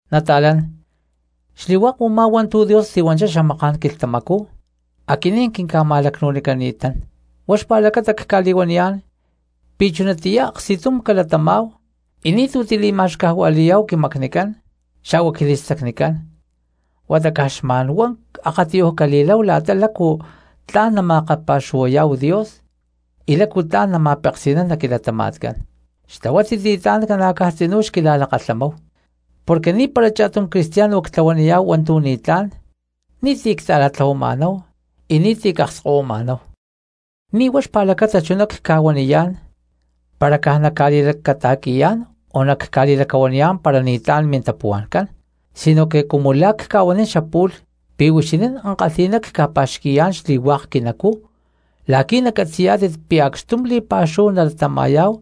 Nata̠lán, xli̠hua̠k u̠má hua̠ntu̠ Dios tihuanchá xamaká̠n quilhtamacú aquinín quinca̠ma̠lacnu̠nicani̠tán. Huá xpa̠lacata cca̠li̠huaniyá̠n pi̠ chunatiyá aksti̠tum calatamá̠hu y ni̠tu̠ tili̠ma̠xcajua̠li̠yá̠hu quimacnicán xa̠hua quili̠stacnicán, huata caj xma̠nhuá akatiyuj cali̠láhu la̠ta lácu tla̠n nali̠makapa̠xuhuayá̠hu Dios y lácu tla̠n nama̠peksi̠nán nac quilatama̠tcán. ¡Xtlahuátit li̠tlá̠n ca̠na̠caj tzinú xquila̠lakalhamáhu! Porque ni̠para cha̠tum cristiano ctlahuaniyá̠hu hua̠ntu̠ ni̠tlá̠n, ni̠ti̠ cta̠ra̠tlahuama̠náhu y ni̠ti̠ cakskahuima̠náhu. Ni̠ huá xpa̠lacata chuná cca̠huaniyá̠n para caj nacca̠li̠lacata̠qui̠yá̠n o nacca̠li̠lacahuaniyá̠n para ni̠tlán mintapuhua̠ncán, sinoque cumu la̠ cca̠huanín xapu̠lh pi̠ huixinín ankalhi̠ná cca̠pa̠xqui̠yá̠n xli̠hua̠k quinacú la̠qui̠ nacatzi̠yá̠tit pi̠ acxtum li̠pa̠xúhu nalatama̠yá̠hu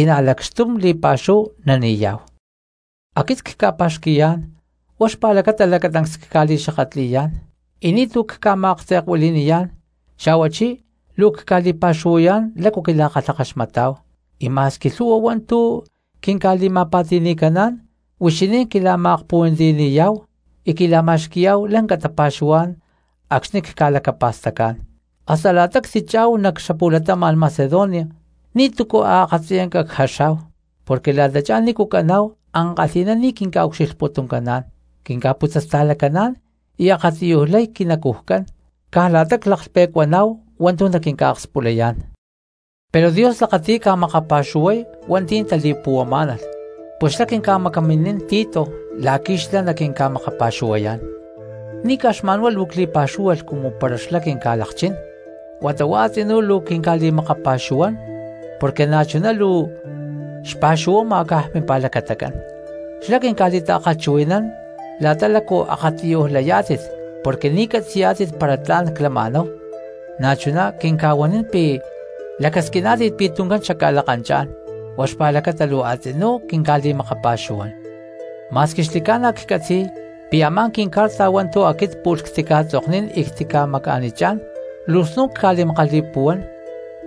y na̠ lacxtum li̠pa̠xúhu nani̠yá̠hu. Aquit cca̠pa̠xqui̠yá̠n huá xpa̠lacata lacatancs cca̠li̠xakatli̠yá̠n y ni̠tu̠ cca̠ma̠aktze̠kuili̠niyá̠n, xa̠huachí luu cca̠li̠pa̠xuhuayá̠n lácu quila̠kalhakaxmatá̠hu, y ma̠squi lhu̠hua hua̠ntu̠ quinca̠li̠ma̠pa̠ti̠ni̠caná̠n huixinín quila̠ma̠akpuhuantiyani̠yá̠hu y quila̠ma̠xqui̠yá̠hu lanca tapa̠xuhuá̠n acxni̠ cca̠lacapa̠stacá̠n. Hasta la̠ta ctichá̠hu nac xapu̠latama̠n Macedonia ni̠tu̠cu a̠ akatziyanca cjaxá̠hu porque la̠tachá nícu caná̠hu ankalhi̠ná ni̠ quinca̠ucxilhputuncaná̠n, quinca̠putzasta̠lacaná̠n, y akatiyuj lay quinacujcán caj la̠ta claklhpe̠cuaná̠hu hua̠ntu̠ naquinca̠akspulayá̠n. Pero Dios lakati̠y ca̠makapa̠xuhuay hua̠nti̠ tali̠puhuamá̠nalh, pus xlá quinca̠macaminín Tito la̠qui̠ xlá naquinca̠makapa̠xuhuay. Ni̠ caj xma̠nhuá luu cli̠pa̠xúhualh cumu para xlá quinca̠lakchín, huata huá a̠tzinú luu quinca̠li̠makapa̠xuhuán porque na̠chuná luu xpa̠xuhuama caj mimpa̠lacatacán; xlá quinca̠li̠ta̠kalhchuhui̠nán la̠ta lácu akatiyuj layá̠tit porque ni̠ catzi̠yá̠tit para tla̠n clama̠náhu, na̠chuná quinca̠huanín pi̠ lacasquiná̠tit pi̠ tuncán xacca̠lakanchá̠n. Huá xpa̠lacata luu a̠tzinú quinca̠li̠makapa̠xuhuán. Ma̠squi xli̠ca̠na ccatzi̠y pi̠ a̠má quincarta hua̠ntu̠ aquit pu̠lh ctica̠tzoknín y ctica̠maca̠nichá̠n luu snu̠n ca̠li̠makali̠puhuán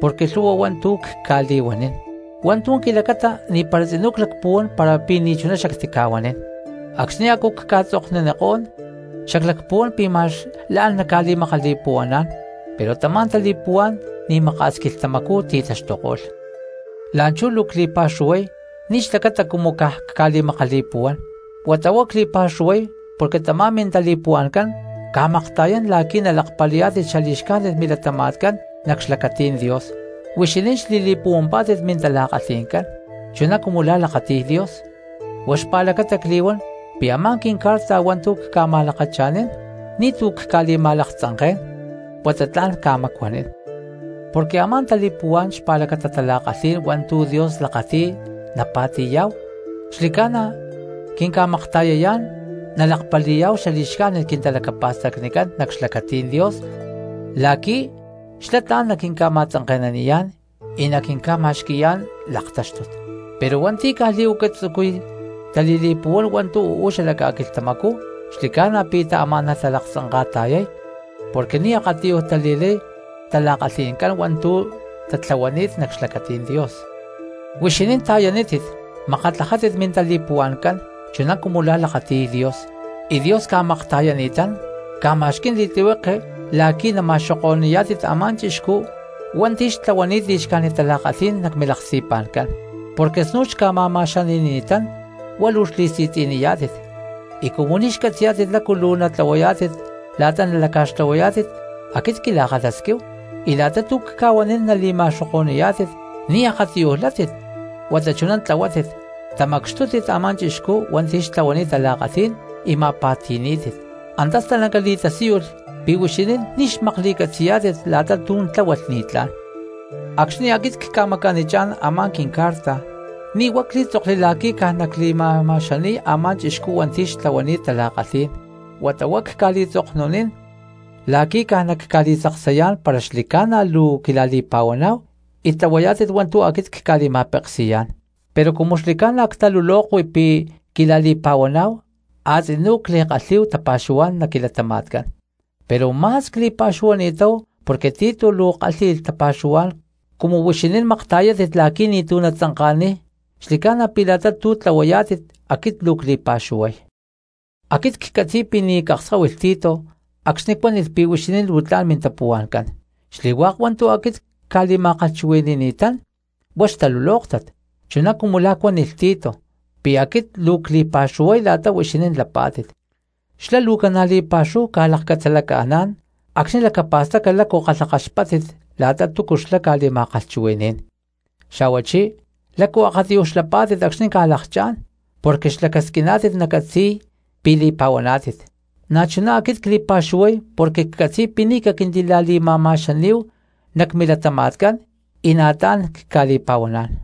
porque lhu̠hua hua̠ntu̠ cca̠li̠huanín, hua̠ntu̠ quilacata ni̠para tzinú clacpuhuán para pi̠ ni̠chuná xactica̠huanín. Acxni̠ a̠cu cca̠tzoknunikó̠n xaclacpuhuán pi̠ ma̠x la̠n nacca̠makali̠puhuaná̠n, pero tamá tali̠puhuá̠n ni̠maka̠s quilhtamacú ti̠taxtuko̠lh. La̠nchú luu cli̠pa̠xuhuay ni̠ xlacata cumu caj cca̠li̠makali̠puhuán, huata huá cli̠pa̠xuhuay porque tamá mintali̠puhua̠ncán ca̠makta̠yán la̠qui̠ nalakpali̠yá̠tit xali̠xcájnit milatama̠tcán nac xlacatí̠n Dios. Huixinín xli̠li̠puhuampá̠tit mintala̠kalhi̠ncán chuná cumu la̠ lakati̠y Dios, huá xpa̠lacata cli̠huán pi̠ a̠má quincarta hua̠ntu̠ cca̠ma̠lakacha̠nín ni̠tu̠ cca̠li̠ma̠laktzanké̠n huata tla̠n ca̠macuanín. Porque a̠má tali̠puhuá̠n xpa̠lacata tala̠kalhí̠n hua̠ntu̠ Dios lakati̠y napa̠ti̠yá̠hu xli̠ca̠na quinca̠makta̠yayá̠n nalakpali̠yá̠hu xali̠xcájnit quintalacapa̠stacnicán nac xlacatí̠n Dios la̠qui̠ xlá tla̠n naquinca̠ma̠tzanke̠naniyá̠n y naquinca̠ma̠xqui̠yá̠n laktáxtut. Pero hua̠nti̠ caj li̠huaca tzucuy tali̠li̠puhuán hua̠ntu̠ uú xala ca̠quilhtamacú xli̠ca̠na pi̠ taamá̠nalh talaktzanka̠ta̠yay, porque ni̠ akatiyuj tali̠lay xtala̠kalhi̠ncán hua̠ntu̠ tatlahuani̠t nac xlacatí̠n Dios. Huixinín ta̠yanítit makatlajátit mintali̠puhua̠ncán chuná cumu la̠ lakati̠y Dios, y Dios ca̠makta̠yani̠tán, ca̠ma̠xquí̠n li̠tlihueke la̠qui̠ nama̠xoko̠ni̠yá̠tit a̠má chixcú hua̠ntu̠ xtlahuani̠t li̠xcájnit tala̠kalhí̠n nac milaksti̠pa̠ncán. Porque snu̠n xca̠ma̠ma̠xani̠ni̠tán huá luu xli̠si̠tzi̠niyá̠tit, y cumu ni̠ xcatzi̠yá̠tit lácu luu natlahuayá̠tit la̠ta nalaca̠xtlahuayá̠tit aquit quila̠kalhasquíhu y la̠ta tu̠ cca̠huanín nali̠ma̠xoko̠ni̠yá̠tit ni̠ akatiyuj li̠látit huata chuná tlahuátit, tamacxtútit a̠má chixcú hua̠nti̠ xtlahuani̠t tala̠kalhí̠n y ma̠pa̠ti̠ní̠tit. Antá stalanca li̠tasíyulh pi̠ huixinín ni̠ xmakli̠catzi̠yá̠tit la̠ta tu̠ tláhualh ni̠tlá̠n. Acxni̠ aquit cca̠maca̠nichá̠n a̠má quincarta, ni̠ huá clí̠tzokli la̠qui̠ caj nacli̠ma̠ma̠xani̠y a̠má chixcú hua̠nti̠ xtlahuani̠t tala̠kalhí̠n huata huá cca̠li̠tzoknunín la̠qui̠ caj nacca̠li̠tzaksayá̠n para xli̠ca̠na luu quila̠li̠pa̠huaná̠hu y tlahuayá̠tit hua̠ntu̠ aquit cca̠li̠ma̠peksi̠yá̠n. Pero cumu xli̠ca̠na ctalulokui pi̠ quila̠li̠pa̠huaná̠hu a̠tzinú cli̠kalhi̠yá̠hu tapa̠xuhuá̠n nac quilatama̠tcán. Pero ma̠s cli̠pa̠xuhuani̠táhu porque Tito luu kalhi̠y tapa̠xuhuá̠n cumu huixinín makta̠yátit la̠qui̠ ni̠tu̠cu natzanka̠niy; xli̠ca̠na̠ pi̠ la̠ta tu̠ tlahuayá̠tit aquit luu cli̠pa̠xuhuay. Aquit ccatzi̠y pi̠ ni̠ cakskáhuilh Tito acxni̠ cuánilh pi̠ huixinín luu tla̠n mintapuhua̠ncán. Xli̠hua̠k hua̠ntu̠ aquit cca̠li̠ma̠kalhchuhui̠ni̠ni̠tán huá xtalulóktat, chuná cumu la̠ cuánilh Tito pi̠ aquit luu cli̠pa̠xuhuay la̠ta huixinín lapá̠tit. Xlá luu ca̠na̠ li̠pa̠xúhu ca̠lakcatzalaca̠ná̠n acxni̠ lacapa̠staca lácu kalhakaxpáttit la̠ta túcu xlá ca̠li̠ma̠kalhchuhui̠ní̠n, xa̠huachí lácu akatiyuj xlapá̠tit acxni̠ ca̠lakchá̠n porque xlacasquiná̠tit nacatzi̠y pi̠ li̠pa̠huaná̠tit. Na̠chuná aquit cli̠pa̠xuhuay porque ccatzi̠y pi̠ ni̠ caquintila̠li̠ma̠ma̠xaní̠hu nac milatama̠tcán y na̠ tla̠n cca̠li̠pa̠huaná̠n.